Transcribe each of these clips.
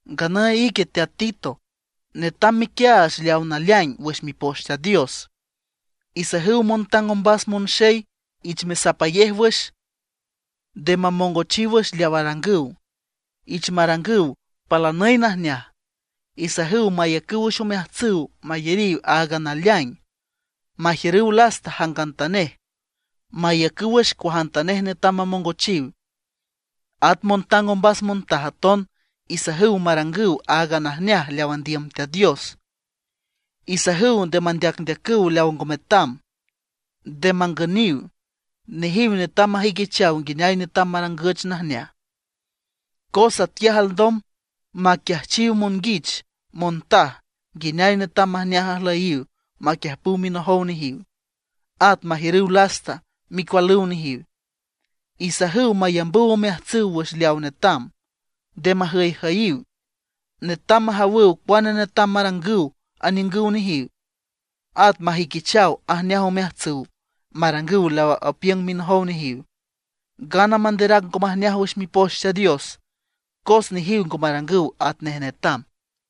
Nganüy ique teat Tito, netam mequiaach leawa naleaing wüx Mipoch Teat Dios. Isajüw montang ombas monxey ich mesapayej wüx, nde mamongochiw wüx leaw arangüw, ich marangüw palanüy najneaj. Isajüw mayacüw wüx omeajtsüw mayariw áagan naleaing, majiürüw lasta jangantanej, maiücüw wüx cuajantanej netam mamongochiw. At montang ombas montaj aton isajüw marangüw áagan najneaj leaw andiüm Teat Dios. Isajüw nde mandeacndeacüw leaw ngo metam. Nde mangüniw. Nejiw netam majüiquichaw nguineay netam marangüch najneaj, cos atquiaj alndom maquiajchiw monguich montaj nguineay netam majneaj ajlüyiw maquiüjpüw minojow nejiw, at majiürüw lasta micualüw nejiw. Isajüw mayambüw omeajtsüw wüx leawa netam, nde majüyjüyiw. Netam majawüw cuane netam marangüw aniüngüw nejiw. At majüiquichaw ajneaj omeajtsüw marangüw leaw apiüng minojow nejiw, ngana manderac ngo majneaj wüx Mipoch Teat Dios cos nejiw ngo marangüw atnej netam.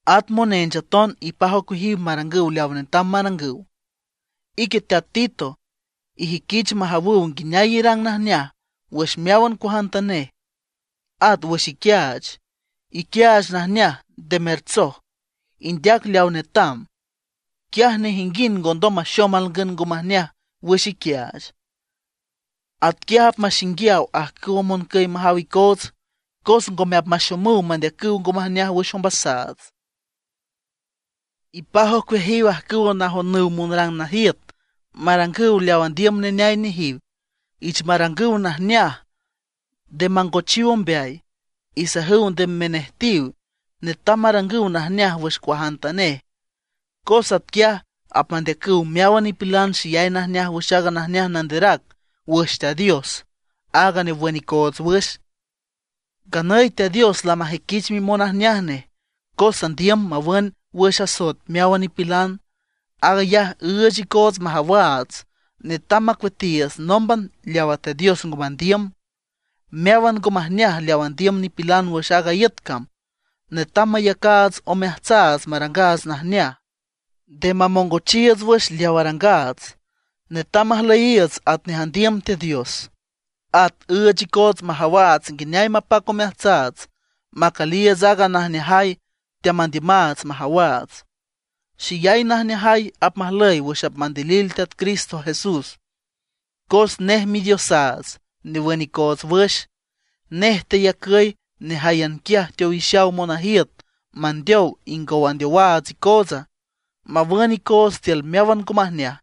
At monench aton ipaj ocueajiw marangüw leaw netam marangüw. Ique teat Tito, ijüiquich majawüw nguineay irang najneaj wüx meáwan cuajantanej. At wüx iquiaach, iquiaach najneaj, nde mertsoj. Indeac leaw netam, quiaj nejinguind ngondom maxom alngün ngo majneaj wüx iquiaach. Atquiaj apmaxinguiaw ajcüwa moncüy majaw icoots, cos ngome apmaxomüw mandeacüw ngo majneaj wüx ombasaats. Ipaj ocueajiw ajcüwa najonüw monrang najiüt, marangüw leaw andiüm neneay nejiw. Ich marangüw najneaj, nde mangochiw ombeay. Isajüw nde menejtiw; netam marangüw najneaj wüx cuajantanej, cos atquiaj apmandeacüw meáwan nipilan xeyay najneaj wüx aaga najneaj nanderac wüx Teat Dios, áag newün icoots wüx. Nganüy Teat Dios lamajüiquich mimonajneaj nej, cos andiüm mawün wüx asoet meáwan nipilan. Aag ayaj üüch icoots majawaats netam macueatiiüts nómban leawa Teat Dios ngo mandiüm, meáwan ngo majneaj leaw andiüm nipilan wüx aaga iüt cam. Netam mayacaats omeajtsaats marangaats najneaj, nde mamongochiiüts wüx leaw arangaats; netam majlüyiiüts atnej andiüm Teat Dios. At üüch icoots majawaats nguineay mapac omeajtsaats macüliiüts aaga najneajay teamandiümaats majawaats. Xeyay najneajay apmajlüy wüx apmandilil Teat Cristo Jesús, cos nej Midiosaats newün icoots wüx. Nej teyacüy nejáyan quiaj teowixaw monajiüt mandeow ingow andeowaats icootsa, mawün icoots tiül meáwan ngo majneaj.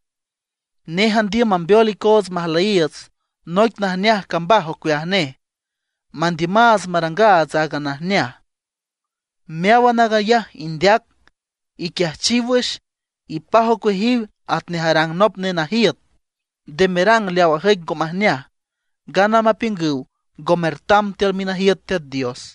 Nej andiüm mambeol icoots majlüyiiüts noic najneaj cambaj ocueaj nej, mandiümaats marangaats áagan najneaj. Meáwan aag ayaj indeac, iquiajchiw wüx, ipaj ocueajiw atnej arang nop nenajiüt. Nde merang leaw ajüic ngo majneaj, ngana mapiüngüw ngo mertam tiül minajiüt Teat Dios.